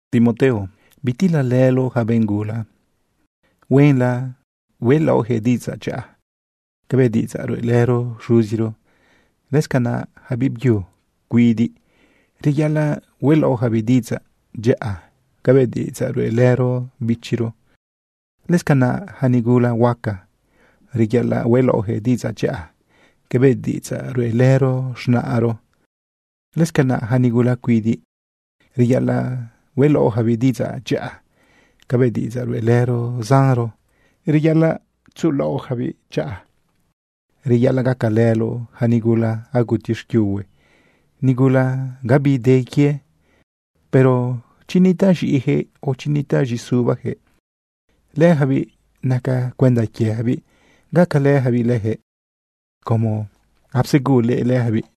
Timoteo, bitilalëloꞌ yaca benꞌ gula. Huenla hueꞌlaoꞌyaquëꞌ diꞌidzaꞌ dyaꞌa cabëꞌ diꞌidzaꞌ ruꞌelëro xuziro. Lëscanaꞌ yaca biꞌbyu cuidiꞌ, reyaꞌalaꞌ hueꞌlaoꞌyacabiꞌ diꞌidzaꞌ dyaꞌa cabëꞌ diꞌidzaꞌ ruꞌelëro bichiro. Lëscanaꞌ yaca nigula huaca, reyaꞌalaꞌ hueꞌlaoꞌyaquëꞌ diꞌidzaꞌ dyaꞌa cabëꞌ diꞌidzaꞌ ruꞌelëro z̃naꞌro. Lëscanaꞌ yaca nigula cuidiꞌ, reyaꞌalaꞌ hueꞌlaoꞌyacabiꞌ diꞌidzaꞌ dyaꞌa cabëꞌ diꞌidzaꞌ ruꞌelëro zanro. Reyaꞌalaꞌ tzuꞌulaoꞌjabiꞌ dyaꞌa. Reyaꞌalaꞌ gacalëloꞌ yaca nigula aguti xquiuhue, nigula abide quie. Pero chi nitaꞌ z̃iꞌijëꞌ, o chi nitaꞌ z̃iꞌisubajëꞌ, lëjabiꞌ naca cuenda quiejabiꞌ gacalëjabiꞌ leyaquëꞌ como apsegulëꞌ leyacabiꞌ.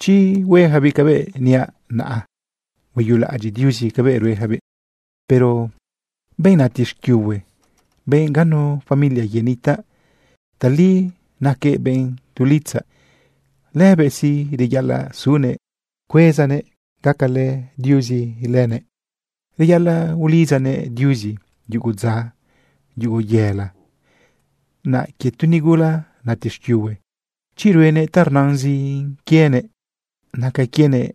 Chi hueyacabiꞌ cabëꞌ niaꞌ, naꞌ hueyulaꞌadyiꞌ Diuzi cabëꞌ rueyacabiꞌ. Pero benꞌ nati xquiuhue, benꞌ ganu familia quiëꞌ nitaꞌ, tali naquëꞌ benꞌ tu litzaꞌ. Lëbëꞌ sí, reyaꞌalaꞌ sunëꞌ rbezanëꞌ gacalë Diuzi lëbëꞌ. Reyaꞌalaꞌ ulidzanëꞌ Diuzi yugu dza, yugu yela. Naꞌ quie tu nigula nati xquiuhue, chi ruenëꞌ ta rnazin quienëꞌ, naca quienëꞌ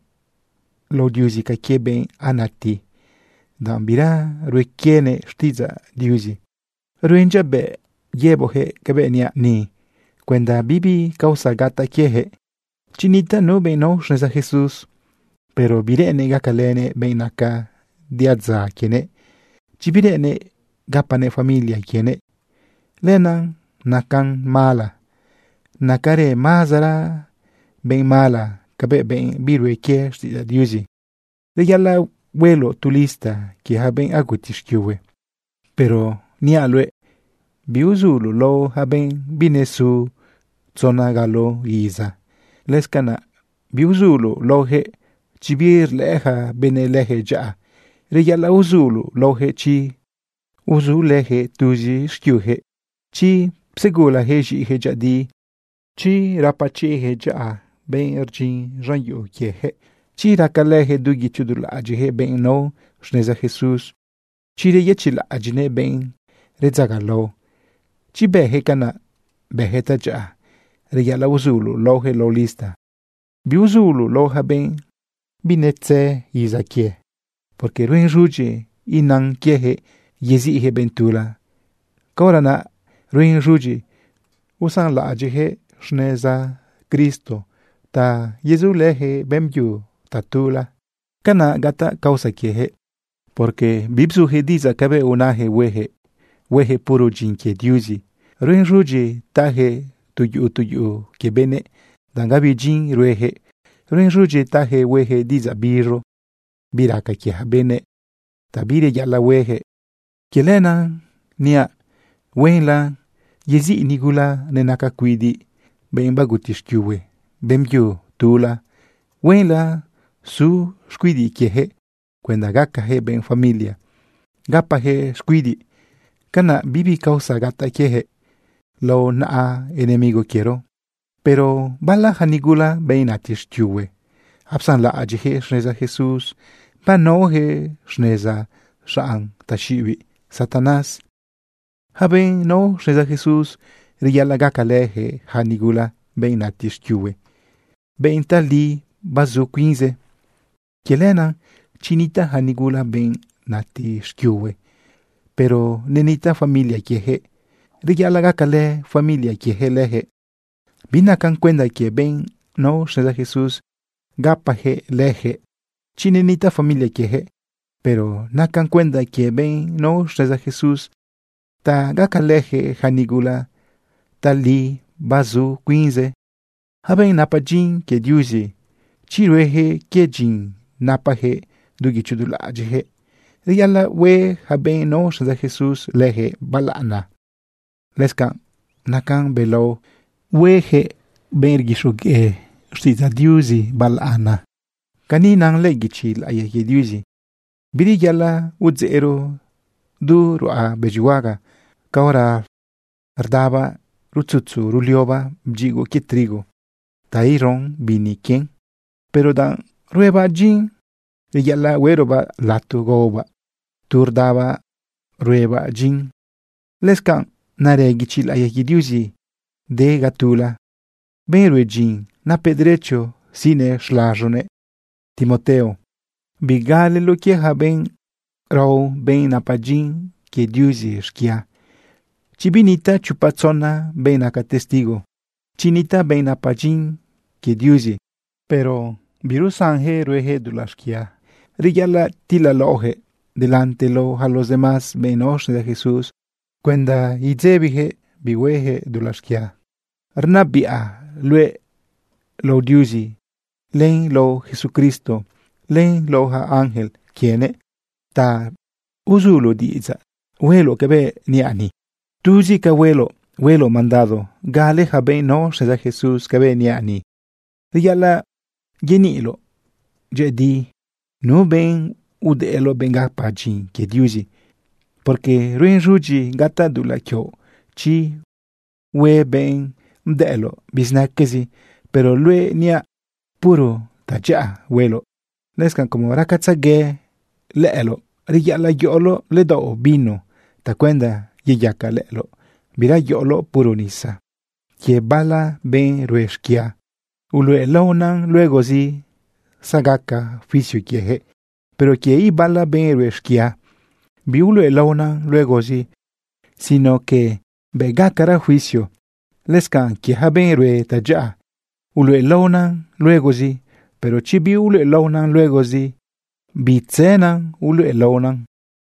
lao Diuzi ca quie benꞌ anati, danꞌ bira rue quienëꞌ xtiꞌidzaꞌ Diuzi. Ruen dyabëꞌ yëboꞌjëꞌ cabëꞌ niaꞌ ni cuenda bibi causa gataꞌ quieyaquëꞌ. Chi nitaꞌ nu benꞌ nao xneza Jesús, pero bireꞌennëꞌ gacalënëꞌ benꞌ naca diadza quienëꞌ, chi bireꞌennëꞌ gapanëꞌ familia quienëꞌ, lenaꞌ nacan mala. Nacarëꞌ mazara benꞌ mala cabëꞌ benꞌ birue quie xtiꞌidzaꞌ Diuzi. Reyaꞌalaꞌ hueloꞌ tu lista quie yaca benꞌ aguti xquiuhue. Pero niaꞌ luëꞌ biuzuloꞌ lao yaca benꞌ binesu tzona galo iza. Lëscanaꞌ biuzuloꞌ laojëꞌ chi birlëꞌë yaca benëꞌ leyaquëꞌ dyaꞌa. Reyaꞌalaꞌ uzuloꞌ laojëꞌ chi uzulëjëꞌ tuzi xquiujëꞌ, chi psegulajëꞌ z̃iꞌijëꞌ dyëꞌëdi, chi gapachiꞌjëꞌ dyaꞌa benꞌ rdyin z̃an yuꞌu quieyaquëꞌ, chi racalëjëꞌ du guichi du laꞌadyiꞌjëꞌ benꞌ nao xneza Jesús, chi reyëchiꞌlaꞌadyiꞌnëꞌ benꞌ redzagalao. Chi bëjëꞌ canaꞌ, bëjëꞌ tadyaꞌa. Reyaꞌalaꞌ uzuloꞌ laoyaquëꞌ lao lista. Biuzuloꞌ lao yaca benꞌ binetze iza quie, porque ruen z̃udyi inan quieyaquëꞌ yeziꞌyaquëꞌ benꞌ tula, caora naꞌ ruen z̃udyi usanlaꞌadyiꞌjëꞌ xneza Cristo ta yezulëyaquëꞌ beꞌmbyu tatula. Canaꞌ gataꞌ causa quieyaquëꞌ, porque bibzujëꞌ diꞌidzaꞌ cabëꞌ unajëꞌ huejëꞌ, huejëꞌ puro dyin quie Diuzi. Ruen z̃udyi tayaquëꞌ tu yuꞌu tu yuꞌu quie benëꞌ, danꞌ gabi dyin ruejëꞌ. Ruen z̃udyi tayaquëꞌ hueꞌyaquëꞌ diꞌidzaꞌ biz̃u bi raca quie yaca benëꞌ ta bireyaꞌalaꞌ hueꞌyaquëꞌ. Quie lenaꞌ niaꞌ huenla yeziꞌ nigula nenaca cuidiꞌ, benꞌ baguti xquiuhue, beꞌmbyu tula. Huenla su xcuidiꞌ quieyaquëꞌ cuenda gacajëꞌ benꞌ familia gapajëꞌ xcuidiꞌ. Canaꞌ bibi causa gataꞌ quieyaquëꞌ lao naꞌa enemigo quiero. Pero bala yaca nigula, benꞌ nati xquiuhue, apsanlaꞌadyiꞌyaquëꞌ xneza Jesús, banaoyaquëꞌ xneza xanꞌ taxiꞌibiꞌ Satanás. Yaca benꞌ nao xneza Jesús, reyaꞌalaꞌ gacalëyaquëꞌ yaca nigula, benꞌ nati xquiuhue, benꞌ tali bazu cuinze. Quie lenaꞌ, chi nitaꞌ yaca nigula, benꞌ nati xquiuhue, pero nenitaꞌ familia quieyaquëꞌ, reyaꞌalaꞌ gacalë familia quieyaquëꞌ leyaquëꞌ. Binacan cuenda quie benꞌ nao xneza Jesús gapajëꞌ lëjëꞌ chi nenitaꞌ familia quieyaquëꞌ. Pero nacan cuenda quie benꞌ nao xneza Jesús ta gacalëjëꞌ ja nigula tali bazu cuinze. Yaca benꞌ napa dyin quie Diuzi, chi rueyaquëꞌ quie dyin napajëꞌ du guicho du laꞌadyiꞌjëꞌ, reyaꞌalaꞌ hue yaca benꞌ nao xneza Jesús leyaquëꞌ balaꞌana. Lëscanꞌ nacan belao hueyaquëꞌ benꞌ rguixogueꞌ xtiꞌidzaꞌ Diuzi balaꞌana. Cani na lëꞌë guichi laꞌiya quie Diuzi: “Bireyaꞌalaꞌ udzeꞌro du ruꞌa bëdyihuaga caora rdabaꞌ rutzutzu ruliobaꞌ bdyigoꞌ quie trigo ta iro bini quien. Pero danꞌ ruebaꞌ dyin, reyaꞌalaꞌ hueꞌrobaꞌ lato gaobaꞌ tu rdabaꞌ huebaꞌ dyin.” Lëscanꞌ narë guichi laꞌiya quie Diuzi de ga tula: “Benꞌ rue dyin, napëꞌ derecho siꞌnëꞌ xlaz̃uguëꞌ.” Timoteo, bigaleloꞌ quie yaca benꞌ rao benꞌ napa dyin quie Diuzi xquia, chi binitaꞌ chopa tzona benꞌ naca testigo. Chi nitaꞌ benꞌ napa dyin quie Diuzi, pero birusanyaquëꞌ huejëꞌ dulaꞌ xquia, reyaꞌalaꞌ tilalaoꞌyaquëꞌ delante lao yaca los demás benꞌ nao xneza Jesús cuenda idzebijëꞌ bihuejëꞌ dulaꞌ xquia. Rnabiꞌa luëꞌ lao Diuzi len lao Jesucristo, len lao yaca ángel quienëꞌ ta uzuloꞌ diꞌidzaꞌ hueloꞌ cabëꞌ niaꞌ ni. Tuzi ca hueloꞌ, hueloꞌ mandado gale yaca benꞌ nao xneza Jesús cabëꞌ niaꞌ ni. Reyaꞌalaꞌ yeniꞌloꞌ dyëꞌëdi nu benꞌ udëꞌloꞌ, benꞌ gapa dyin quie Diuzi, porque ruen z̃udyi gataꞌ dulaꞌ quioꞌ chi hue benꞌ bdëꞌloꞌ bizinaquezi. Pero luëꞌ, niaꞌ, puro tadyaꞌa hueloꞌ. Lëscanꞌ como racatzegue lëꞌëloꞌ, reyaꞌalaꞌ yoꞌoloꞌ ledaoꞌ vino tacuenda yeyaca lëꞌëloꞌ. Bira yoꞌoloꞌ puro nisa. Quie bala benꞌ rue xquia, uluꞌelaonan luegozi zagaca juicio quieyaquëꞌ. Pero quie ibala benꞌ rue xquia, biuluꞌelaonan luegozi sino que bëꞌ gacara juicio. Lëscanꞌ quie yaca benꞌ rue tadyaꞌa, uluꞌelaonan luegozi. Pero chi biuluꞌelaonan luegozi, bitzënan uluꞌelaonan.